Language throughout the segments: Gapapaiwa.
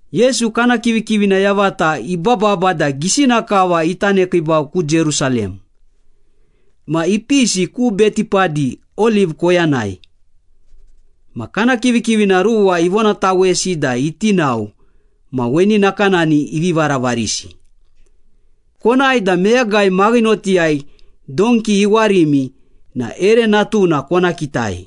Yesu kana kivikivina yavata ibababa da gisina kava ita nekiibau ku Jerusalem. Ma ipisi ku Betipadi, Oliv koyanai. Ma kana kivikivina ruwa ivonatawesi da iti nao ma weni nakanani ivi varavarisi. “Konae da meyagai maghinotiyai donki iwarimi na ere natuna kona kitai.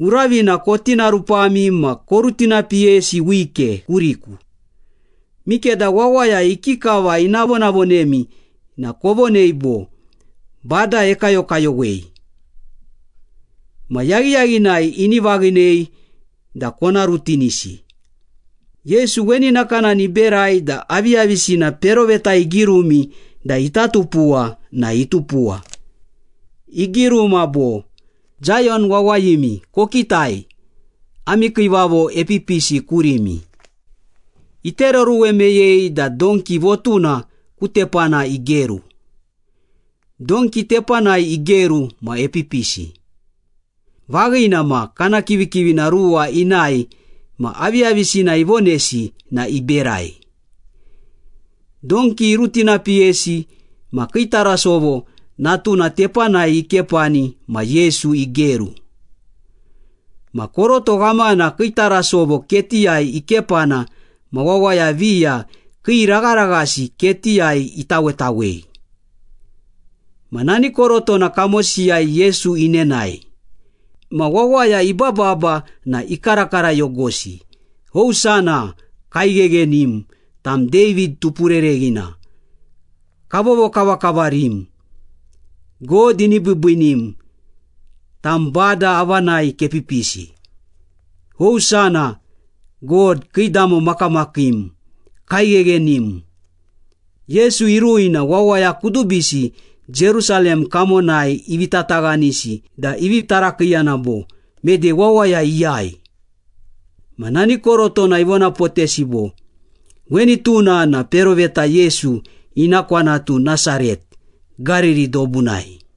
Uravina kotinarupami ma korutinapiyesi wike kuriku. Mikeda wawaya ikikava ina vonavonemi na kovonei bo, ‘Bada ekayokayowei.’ Ma yaghiyaghinai ini vaghinei da kona rutinisi.” Yesu weni nakanani iberai da aviyavisina peroveta igirumi da ita tupuwa na itupuwa. Igiruma bo, “Zayon wawayimi, Kokitai, ami kiivavo epipisi kurimi, Itereoruwe meyei da donki votuna ku tepana igeru, Donki tepanai igeru ma epipisi.” Vaghina ma, kana kivikivina ruwa inae ma aviyavisina ivonesi na iberai. Donki irutinipiyesi ma kii tarasovo natuna tepanai ikepani ma Yesu igeru. Ma koroto ghamana kii tarasovo ketiyai ikepana ma wawaya viya kii ragharaghasi ketiyai itawetawei. Ma nani korotona kamosiyai Yesu inenae. Ma wawaya ibababa na ikarakarayogosi. “Hosana! Kaigheghenim! Tam David Tupurereghina, kavovokavakavarim! God ini biibiinim, tam Bada avanai kepipisi! Hosana, God, kiidamo makamakiim, kaigheghenim!” Yesu irui na wawaya kudubisi Jerusalem kamonai ivi tataghanisi da ivi tarakiiyana bo, “Mede wawaya iyai?” Ma nani korotona ivonapotesi bo, “Weni tuna na peroveta Yesu, ina kwanatu Nasaret, Gariri dobunai.”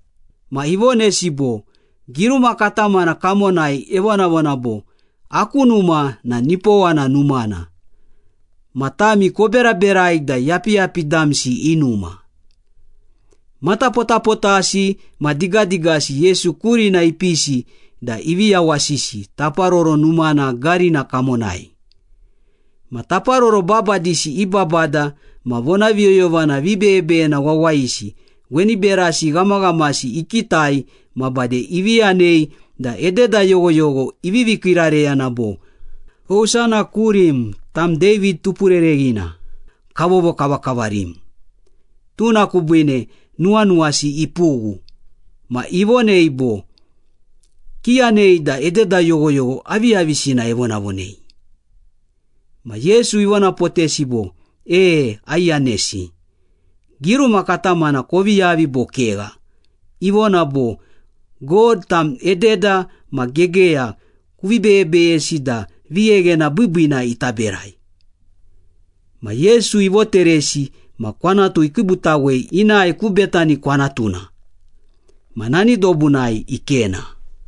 Ma ivonesi bo, “Giruma katamana kamonai evonavona bo, ‘Aku numa na nipowana numana.’ Ma tami, koberaberai da yapiyapi damsi i numa.” Matapotapotasi ma digadigasi Yesu kurina ipisi da ivi yawasisi Taparoro Numana garina kamonai. Ma taparoro babadisi i babada ma vonaviyoyovana vibeyebeyena wawayisi weni berasi ghamaghamasi ikitai ma bade ivi yanei da ededa yoghoyogho ivivi kiirareyana bo, “Hosana kurim, tam David Tupurereghina, kavovokavakavarim.” Tuna kubiine nuwanuwasi ipughu, ma ivonei bo, “Kiyanei da ededa yoghoyogho aviyavisina evonavonei?” Ma Yesu ivonapotesi bo, “E, aiyanesi. Giruma katamana kovi yavi bo kegha? Ivona bo, ‘God, tam ededa ma gegeya kuvi beyebeyesi da vigheghena biibiina ita berai.’” Ma Yesu ivoteresi ma kwanatu ikiibutawei inae ku Betani kwanatuna, ma nani dobunai ikena.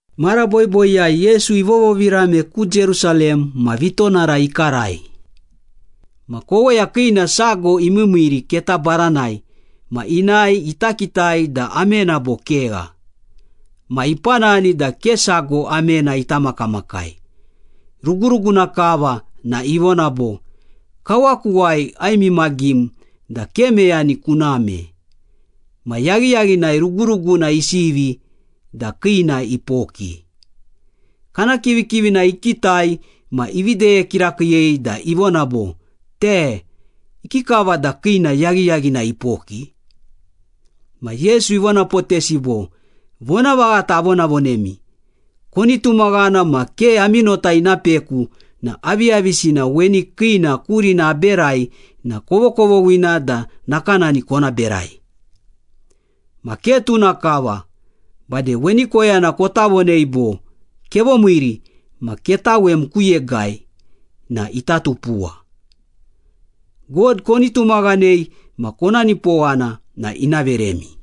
Mara boiboiyai Yesu ivovovirame ku Jerusalem ma vitonara ikarai. Ma koweya kiina sago imiimiiri keta baranai ma inae ita kitai da amena bo kegha. Ma ipanani da ke sago amena ita makamakai, ruguruguna kava na ivona bo, “Kawakuwai aimimagim da ke meyani kuname!” Ma yaghiyaghinai ruguruguna isivi da kiina ipoki. Kana kivikivina ikitai ma ivi deye kirakiiyei da ivona bo, “Te! Ikikava da kiina yaghiyaghinai ipoki?” Ma Yesu ivonapotesi bo, “Vonavaghata avonavonemi, koni tumaghana ma ke ami nota ina peku na aviyavisina weni kiina kurina aberai na kovokovoghina da nakanani kona berai. Ma ke tuna kava, bade weni koyana kota vonei bo, ‘Kevomiiri, ma ketawem ku yegai’ na ita tupuwa. God koni tumaghanei ma kona nipowana na ina veremi.”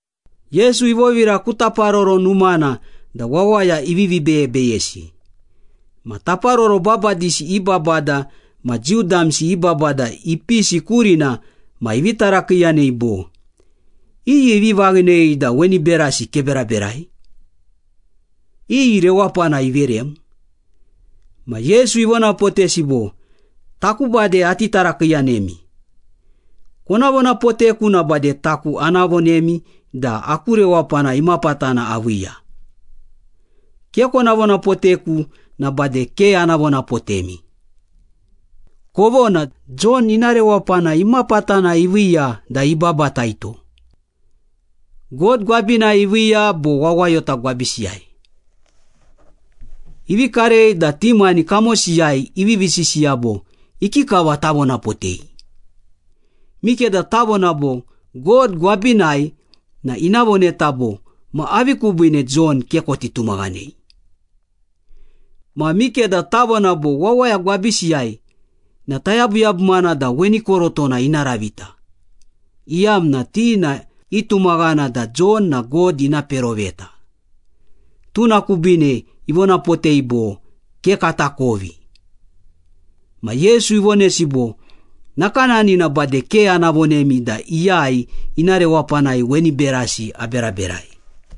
Yesu ivovira ku Taparoro Numana da wawaya ivivi beyebeyesi. Ma taparoro babadisi i babada ma Jiu damsi i babada ipisi kurina ma ivi tarakiiyanei bo, “Iyi ivi vaghinei da weni berasi keberaberai? Iyi rewapana iverem?” Ma Yesu ivonapotesi bo, “Taku bade ati tarakiiyanemi. Kona vonapoteku na bade taku ana vonemi da aku rewapana imapatana aviiya. Ke kona vonapoteku na bade ke ana vonapotemi. Kovona, Jon ina rewapana imapatana iviiya da ibabataito? God gwabinai iviiya bo wawayota gwabisiyai?” Ivi karei da ti mani kamosiyai ivivi sisiya bo, “Ikikava tavonapotei? Mikeda tavona bo, ‘God gwabinai’ na ina voneta bo, ‘Ma avi kubiine Jon ke koti tumaghanei?’ Ma mikeda tavona bo, ‘Wawaya gwabisiyai’ na tayabuyabumana da weni korotona ina ravita, iyamna ti na itumaghana da Jon na God ina peroveta.” Tuna kubiine ivonapotei bo, “Ke katakovi.” Ma Yesu ivonesi bo, “Nakanani na bade ke ana vonemi da iyai ina rewapanai weni berasi aberaberai.”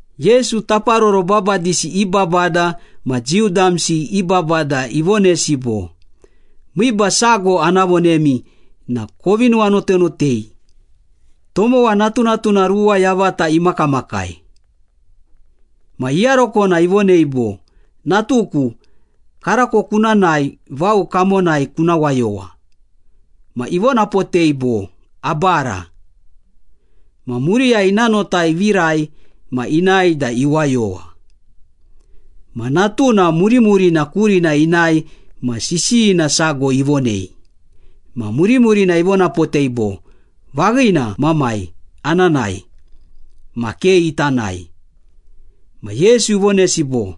Yesu, taparoro babadisi i babada ma Jiu damsi i babada ivonesi bo, “Miiba sago ana vonemi na kovi nuwanotanotei. Tomowa natunatuna ruwa yavata imakamakai. Ma iyarokona ivonei bo, ‘Natuku, karako kuna nae vao kamonai kuna wayowa.’ Ma ivonapotei bo, ‘Abara.’ Ma muriyai ina nota ivirai ma inae da iwayowa. Ma natuna murimurina kurina inae ma sisiyina sago ivonei. Ma murimurina ivonapotei bo, ‘Vaghina, mamai, ana nae.’ Ma ke ita nae.” Ma Yesu ivonesi bo,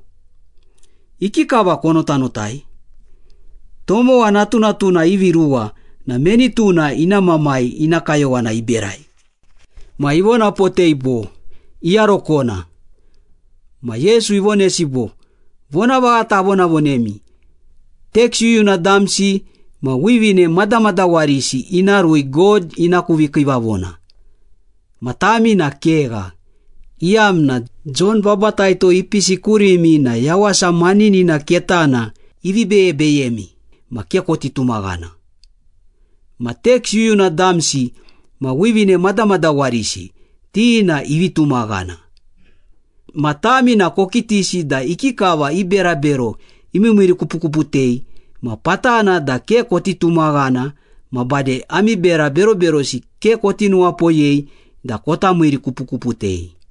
“Ikikava konotanotai? Tomowa natunatuna ivi ruwa na meni tuna ina mamai ina kayowana iberai?” Ma ivonapotei bo, “Iyarokona.” Ma Yesu ivonesi bo, “Vonavaghata avonavonemi, teks yuyuna damsi ma wivine madamadawarisi ina rui God ina ku vikiivavona, ma tami na kegha, iyamna Jon Babataito ipisi kurimi na yawasa maninina ketana ivi beyebeyemi ma ke koti tumaghana. Ma teks yuyuna damsi ma wivine madamadawarisi, ti na ivi tumaghana. Ma tami na kokitisi da ikikava i berabero imiimiirikupukuputei ma patana da ke koti tumaghana ma bade ami bera beroberosi ke koti nuwapoyei da kota miirikupukuputei.”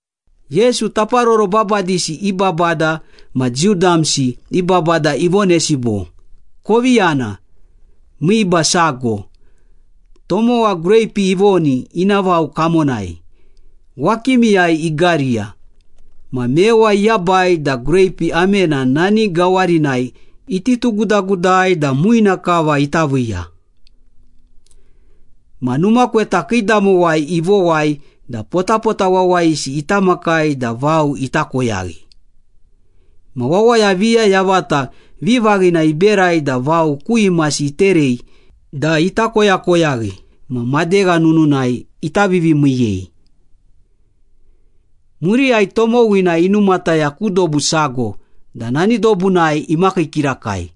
Yesu, taparoro babadisi i babada ma Jiu damsi i babada ivonesi bo, “Kovi yana. Miiba sago. Tomowa greipi ivoni ina vao kamonai, wakimiyai igariya, ma mewa iyabai da greipi amena nani gawarinai iti tugudagudai da muina kava ita viiya. Ma numa kweta kiidamowai ivowai da potapota wawayisi ita makai da vao ita koyaghi. Ma wawaya viya yavata vivaghina iberai da vao ku imasi iterei da ita koyakoyaghi ma madegha nununai ita vivimiiyei. Muriyai tomowina inumataya ku dobu sago da nani dobunai imakii kirakai.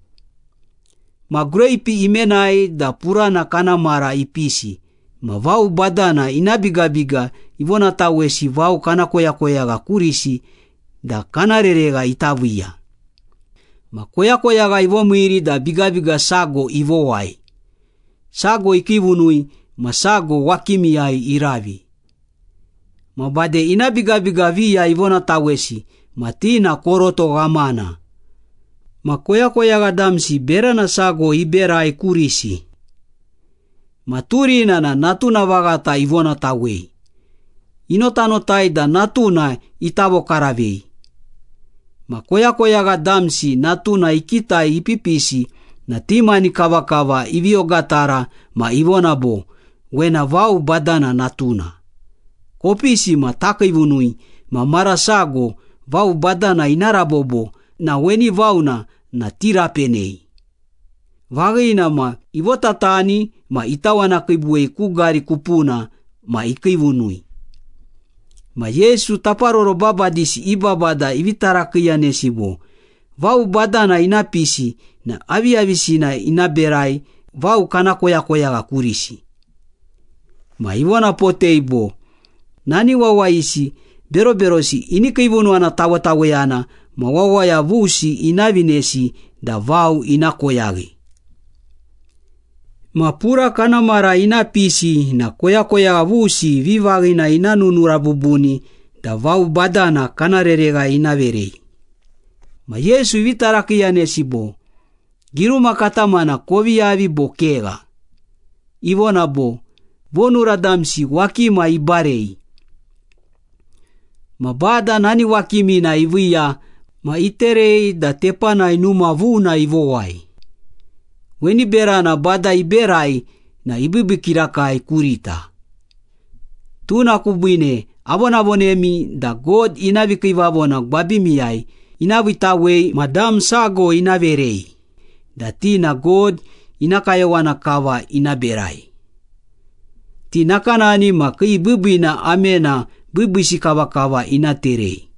Ma greipi imenai da purana kana mara ipisi ma vao badana ina bigabiga ivonatawesi vao kana koyakoyagha kurisi da kana reregha ita viiya. Ma koyakoyagha ivomiiri da bigabiga sago ivowai, sago ikiivunui ma sago wakimiyai iravi. Ma bade ina bigabiga viya ivonatawesi ma ti na koroto ghamana, ma koyakoyagha damsi berana sago iberai kurisi. Ma turina na natuna vaghata ivonatawei. Inotanotai da natuna ita vokaravei. Ma koyakoyagha damsi natuna ikitai ipipisi na ti mani kavakava ivi ogatara ma ivona bo, ‘Wena vao badana natuna. Kopisi ma takiivunui ma mara sago vao badana ina rabobo na weni vao na tirapenei.’ Vaghina ma, ivotatani ma itawanakiibuwei ku gari kupuna ma ikiivunui.” Ma Yesu taparoro babadisi i babada ivi tarakiiyanesi bo, “Vao badana ina pisi na aviyavisina ina berai vao kana koyakoyagha kurisi?” Ma ivonapotei bo, “Nani wawayisi beroberosi ini kiivunuwana tawetaweyana ma wawaya vusi ina vinesi da vao ina koyaghi. Ma pura kana mara ina pisi na koyakoyagha vusi vivaghina ina nunura bubuni da vao badana kana reregha ina verei.” Ma Yesu ivi tarakiiyanesi bo, “Giruma katamana kovi yavi bo kegha? Ivona bo, ‘Vonura damsi wakima ibarei. Ma Bada nani wakimina iviiya ma iterei da tepanai numa vuna ivowai. Weni berana Bada iberai na ibiibii kirakai kurita.’” “Tuna kubiine avonavonemi da God ina vikiivavona gwabimiyai ina viitawei ma dam sago ina verei, da ti na God ina kayowana kava ina berai. Ti nakanani ma kii biibiina amena biibiisi kavakava ina terei.”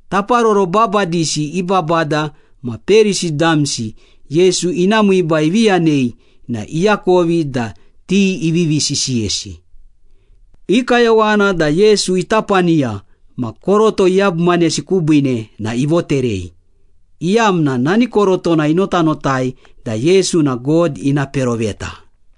Taparoro babadisi i babada ma Perisi damsi Yesu ina miiba ivi yanei na iakovi da ti ivivi sisiyesi. I kayowana da Yesu ita paniya ma koroto iyabumanesi kubiine na ivoterei, iyamna nani korotona inotanotai da Yesu na God ina peroveta.